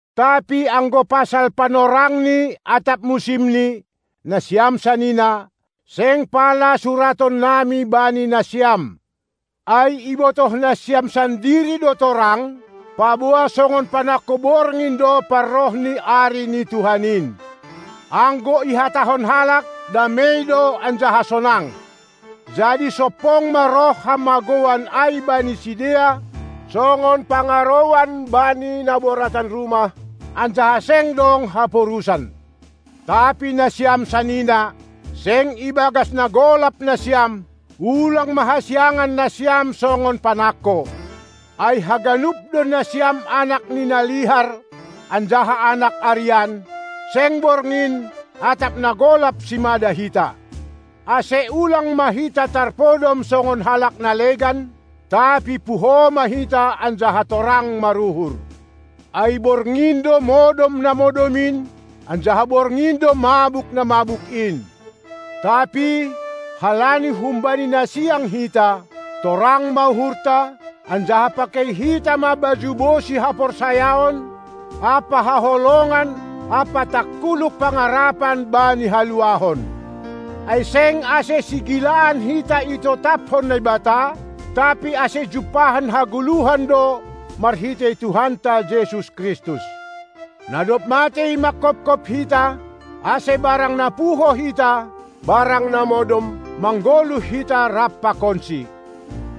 Tapi anggo pasal panorangni atap musimni, nasiam sanina, seng pala suratonnami bani nasiam. Ai ibotoh nasiam sandiri do torang, paboa songon panangko borngin do parroh ni Ari ni Tuhan in. Anggo ihatahon halak: "Damei do anjaha sonang", jadi sompong ma roh hamagouan ai bani sidea, songon pangarouan bani na boratan rumah, anjaha seng dong haporusan. Tapi nasiam sanina, seng ibagas na golap nasiam, ulang ma hasiangan nasiam songon panangko. Ai haganup do nasiam anak ni na lihar anjaha anak arian, seng borngin atap na golap simada hita. Ase ulang ma hita tarpodom songon halak na legan, tapi puho ma hita anjaha torang maruhur. Ai borngin do modom na modom in, anjaha borngin do mabuk na mabuk in. Tapi, halani humbani na siang hita, torang ma uhurta, anjaha pakei hita ma baju bosi haporsayaon ampa haholongan ampa tangkuluk pangarapan bani haluahon. Ai seng, ase sigilaan hita itotaphon Naibata, tapi ase jumpahan hagoluhan do marhitei Tuhanta Jesus Kristus, na dob matei manghophop hita, ase barang na puho hita, barang na modom, manggoluh hita rap pakonSi.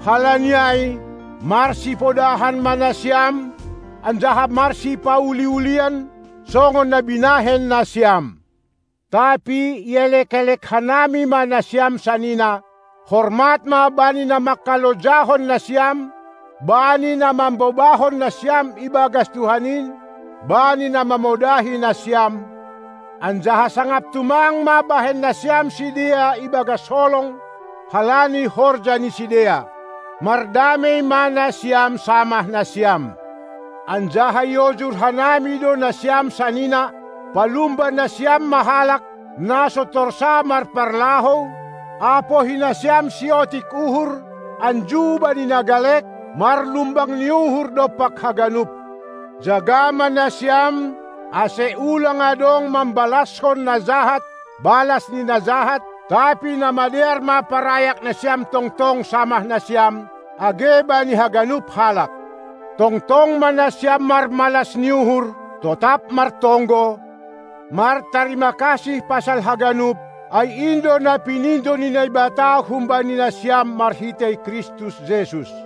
Halani ai marsipodahan ma nasiam anjaha marsipauli-ulian, songon na binahen nasiam. Tapi ielek-elek hanami ma nasiam sanina: Hormat ma bani na manghalojahon nasiam, bani na mambobahon nasiam ibagas Tuhan in, bani na mamodahi nasiam, anjaha sangap tumang ma bahen nasiam sidea ibagas holong halani horja ni sidea. Mardamei ma nasiam samah nasiam. Anjaha iojur hanami do nasiam sanina: Palumba nasiam ma halak, na so torsa marparlahou, apohi nasiam siotik uhur, anju bani na galek, marlumbang ni uhur dompak haganup. Jaga ma nasiam, ase ulang adong mambalaskon na jahat balas ni na jahat, tapi na madear ma parayak nasiam tongtong samah nasiam, age bani haganup halak. Tongtong ma nasiam marmalas ni uhur, totap martonggo, martarima kasih pasal haganup, ai in do na pinindo ni Naibata humbani nasiam marhitei Kristus Jesus.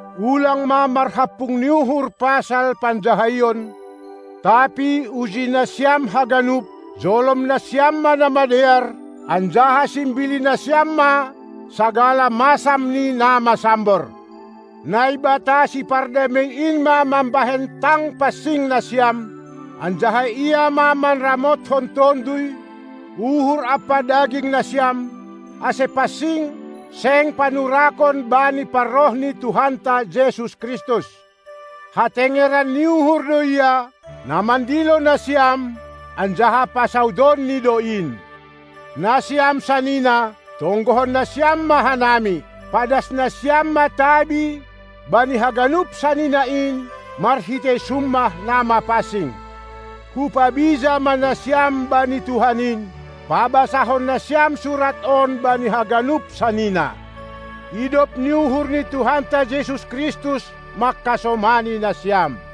ulang ma marhampung ni uhur pasal panjahaion, tapi uji nasiam haganup, jolom nasiam ma na madear, anjaha simbili nasiam ma sagala masam ni na masambor. Naibata sipardamei in ma mambahen tang pansing nasiam, anjaha Ia ma manramothon tonduy, uhur ampa daging nasiam, ase pansing, seng panurakon bani parroh ni Tuhanta Jesus Kristus! Hatengeran ni uhur do Ia, na mandilo nasiam, anjaha pasaudonNi do in. Nasiam sanina, tonggohon nasiam ma hanami. Padas nasiam ma tabi bani haganup sanina in marhitei summah na mapansing. Hupabija ma nasiam bani Tuhan in, pabasahon nasiam surat on bani haganup sanina. Idop ni uhur ni Tuhanta Jesus Kristus mangkasomani nasiam!